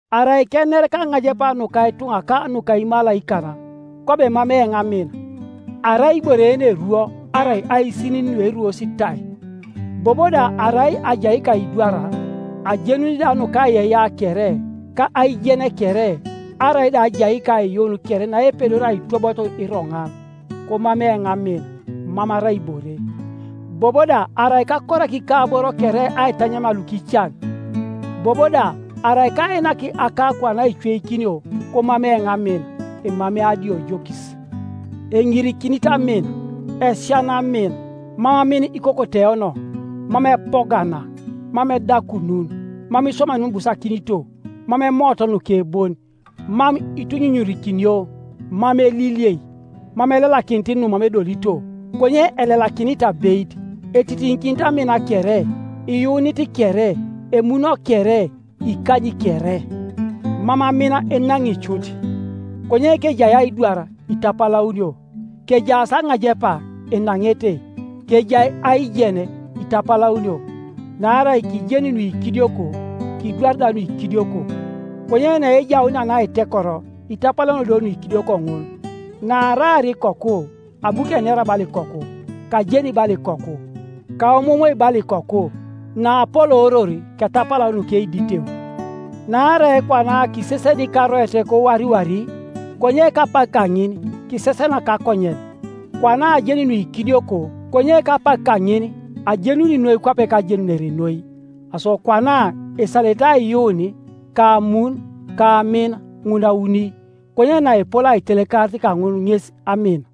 Arai kener kaŋajepa nuka ituŋa ka nuka imalaikan, kwabo emamei eoŋ amin, arai ibore yeneruo arai aisinin nueruos tai. Bobo da arai ajai kaidwar, ajenuni da nukaiyeiyea kere, ka aijen kere, arai da ajai kaiyuun kere naepedori aitwobot iroŋan, komamei eoŋ amin, mam arai ibore. Bobo da arai kakorak ikaboro kere aitanyamia lukican, bobo da arai kainak akakuan aicweikinio, komamei eoŋ amin, emamei adiojokis. Eŋirikinit amin, esiana amin; mam amin ikokoteono, mam epogana, mam edakunun, mam iswamai numam ibusakinito, mam emoot nuke bon, mam itunyunyurikinio, mam eliliei, mam elelakinit numam edolito, konye elelakinit abeit. Etitiŋikinit amin kere, iyuunit kere, emuno kere, ikanyi kere. Mam amin enaŋi cut; konye kejai aidwar itapalaunio; kejaas aŋajepa, enaŋete; kejai aijen, itapalaunio. Naarai kijeni nuikidioko, kidwari da nuikidioko, konye naejaunia naitekoro, itapalaunio do nuikidioko ŋun. Naaraar ikoku, abu kenera bala ikoku, kajeni bala ikoku, kaomoomoi bala ikoku; naapolooror ketapalau nukeiditeu. Naarai kwana kiseseni karoet kowariwari, konye kapak kaŋin kisesena kakonyen; kwana ajeni nuikidioko, konye kapak kaŋin ajenuni noi kwape kajenunere noi. Aso kwana esalete aiyuun, ka amun, ka amin, ŋun auni; konye naepol aitelekarit kaŋun ŋes amin.